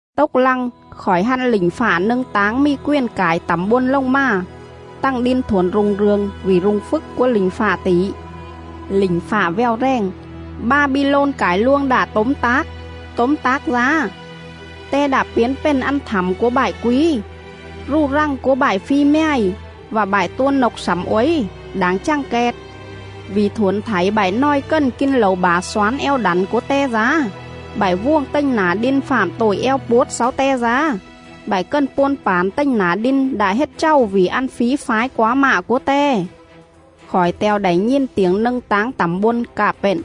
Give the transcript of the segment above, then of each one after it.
Tốc lăng, khỏi hăn lỉnh fạ nâng táng mì quền cải tẳm bôn lồng mà; tằng đin thuổn rung rường vỉ rung phjức cúa lỉnh fạ tỉ. Lỉnh fạ vèo rèng: “Ba-bi-lôn cải luông đạ tốm tác, tốm tác dá! Te đạ piến pền ăn thẳm cúa bại quí, Rù rằng cúa bại phi mjài, Vạ bại tua nộc slẳm uối, đảng chằng kẹt.. Vỉ thuổn thảy bại nòi cần kin lẩu bả xoán eo đẳn cúa te dá,. Bại vuồng tềnh nả đin fạm tội eo puốt xáu te dá, Bại cần puôn pản tềnh nả đin đạ hết chàu vỉ ăn fí fái quá mạ cúa te.” Khỏi te̱o đảy nhìn tiểng nâng táng tẳm bôn, cạ pện:.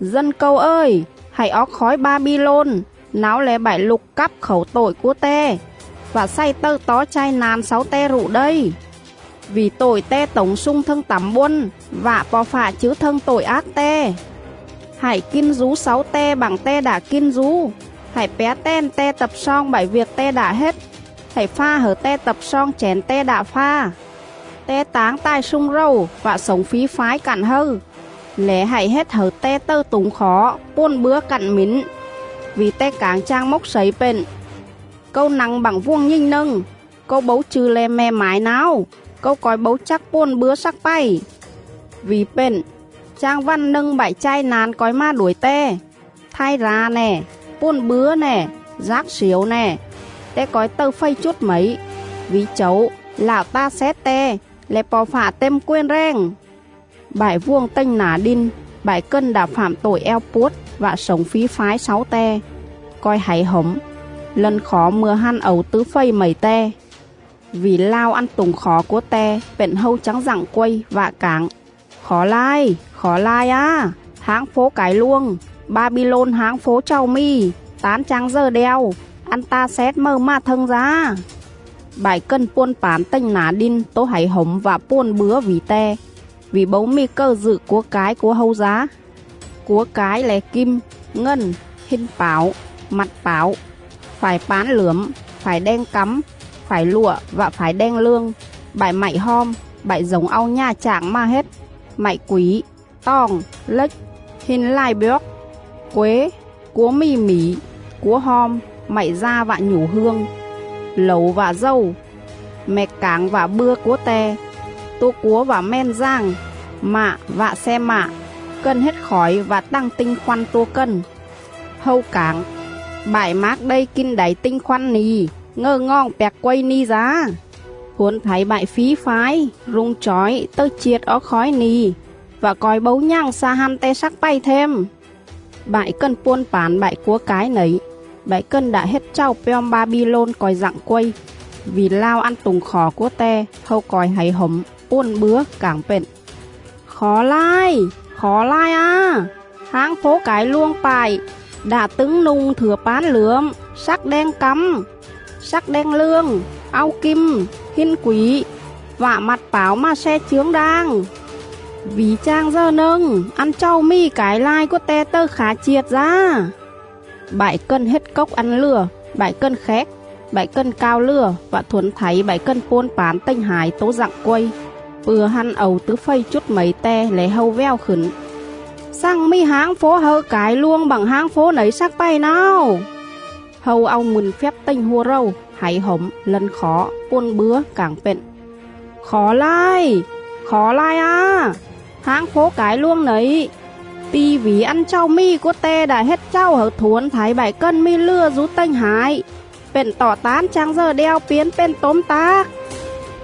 “Dân Câu ời, hạy oóc khói Ba-bi-lôn! Náo le̱ bại lục cáp khảu tội cúa te, Vạ xày tầư tó chai na̱n xáu te rụ đây; Vỉ tội te tổng slung thâng tẳm bôn. Vạ Po̱ Fạ chứ thâng tội ác te.. Hạy kin dú xáu te bặng te đạ kin dú, Hạy pjá tèn te tập sloong bại viêc te đạ hết. Hạy pha hẩư te tập sloong chẻn te đạ pha.. Te táng tài slung rầu vạ slổng fí fái cặn hâư,. Lẻ hạy hết hẩư te tầư tủng khỏ, puồn bứa cặn mỉn. Vỉ te cảng chang mốc slẩy pện: ‘Câu nă̱ng bặng vuồng nhình nâng! Câu bấu chư̱ le̱ me̱ mải náo, Câu co̱i bấu chắc puồn bứa slắc pày.’ Vỉ pện, chang vằn nâng bại chai na̱n co̱i mà đuổi te: Thai ra̱ nè, puồn bứa nè, dác sliểu nè. Te co̱i tầư fầy chút mẩy, Vỉ Chẩu, Lạo ta xét te, le̱ Po̱ Fạ têm quền rèng.” Bại vuồng tềnh nả đin, bại cần đạ fạm tội eo puốt vạ slổng fí fái xáu te, co̱i hảy hổm, lân khỏ mư̱a hăn ẩu tứ fầy mẩy te.. Vỉ lao ăn tủng khỏ cúa te pện hâu chắng dặng quây, vạ cảng: “Khỏ lai! Khỏ lai á! Háng fố cải luông, Ba-bi-lôn háng fố chàu mì! Tán chang dờ đeo, ăn ta xét mầư mà thâng dá!” Bại cần puôn pản tềnh nả đin tố hảy hổm vạ puồn bứa vỉ te, vỉ bấu mì cầư dự cúa cái cúa hâu dá.. Cúa cái le̱ kim, ngần, hin pảo, mặt pảo; phải pán lưởm, phải đeng cắm, phải lụa vạ phải đeng lương; bại mạy hom; bại dổng au nhà chạng mà hết, mạy quỉ, toòng, lếch, hin lài bjoóc;. quế, cúa mì mỉ, cúa hom, mạy da vạ nhủ hương; lẩu vạ dầu, mẹc cảng vạ bưa cúa te; tua cúa vạ mèn dàng, mạ vạ xe mạ; cần hết khỏi vạ tằng tinh khoăn tua cần. Hâu cảng: “Bại mác đây kin đảy tinh khoăn ni̱ ngầư ngoòng pjạc quây ni̱ dá; thuổn thảy bại fí fái, rung chỏi tầư chiệt oóc khói ni̱ vạ co̱i bấu nhằng xa hăn te slắc pày them.” Bại cần puôn pản bại cúa cái nẩy, bại cần đạ hết chàu pjom Ba-bi-lôn co̱i dặng quây, vỉ lao ăn tủng khỏ cúa te; hâu co̱i hảy hổm, puồn bứa,. cảng pện: “Khỏ lai! Khỏ lai á! Háng fố cải luông pại đạ tứng nu̱ng phải pán lưởm, slắc đeng cắm, slắc đeng lương, au kim, hin quỉ vạ mặt pảo mà sle chướng đang! Vỉ chang dờ nâng, ăn chàu mì cải lai cúa te tầư khả chiệt dá.”. Bại cần hết cốc ăn lừa, bại cần khéc, bại cần cao lừa vạ thuổn thảy bại cần puôn pản tềnh hải tố dặng quây; pư̱a hăn ẩu tứ fầy chút mẩy te lẻ hâu vèo khửn: “Xằng mì háng fố hâư cải luông bặng háng fố nẩy slắc pày náo!”. Hâu au mư̱n phjắp tềnh hua rầu, hảy hổm, lân khỏ, puồn bứa, cảng pện: “Khỏ lai! Khỏ lai á! Háng fố cải luông nẩy, ti̱ vỉ ăn chàu mì cúa te đạ hết chàu hẩư thuổn thảy bại cần mì lừa dú tềnh hải; pện tọ tán chang dờ đeo piến pền tốm tác!.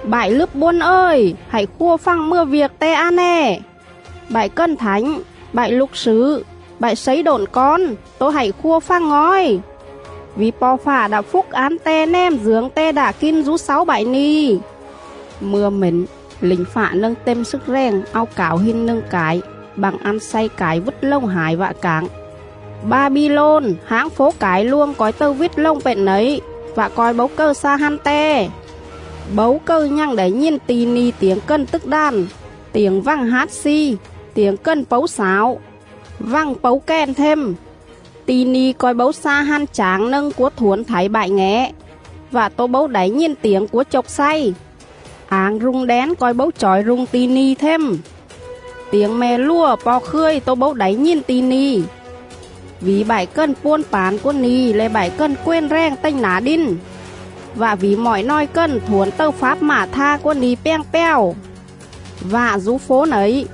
Bại lứp bôn ời, hạy khua fằng mừa viêc te a nè! Bại cần thảnh, bại lục slử, bại slấy độn cón tố hạy khua fằng ngòi! Vỉ Po̱ Fạ đạ phúc án te nèm dưởng te đạ kin dú xáu bại ni̱.”. Mư̱a mển, lỉnh fạ nâng têm slức rèng au cảo hin nâng cải bặng ăn xay cải vít lồng hải vạ cảng: “Ba-bi-lôn, háng fố cải luông co̱i tầư vít lồng pện nẩy, vạ co̱i bấu cầư xa hăn te.. Bấu cầư nhằng đảy nhìn ti̱ ni̱ tiểng cần tức đàn, tiểng vằng hát sli, tiểng cần pấu slảo, vằng pấu kèn them. Ti̱ ni̱ co̱i bấu xa hăn chảng nâng cúa thuổn thảy bại ngẻ; vạ tố bấu đảy nhìn tiểng cúa chộc xay... Ảng rung đén co̱i bấu chỏi rung ti̱ ni̱ them; tiểng me̱ lùa po̱ khươi tố bấu đảy nhìn ti̱ ni, vỉ bại cần puôn pản cúa ni̱ le̱ bại cần quền rèng tềnh nả đin, vạ vỉ mọi nòi cần thuổn tầư fáp ma̱ tha cúa ni̱ pjàng pjào. Vạ dú fố nẩy,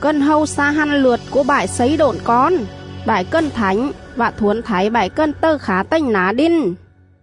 cần hâu xa hăn lượt cúa bại slấy độn cón, bại cần thảnh vạ thuổn thảy bại cần tầư khả tềnh nả đin.”.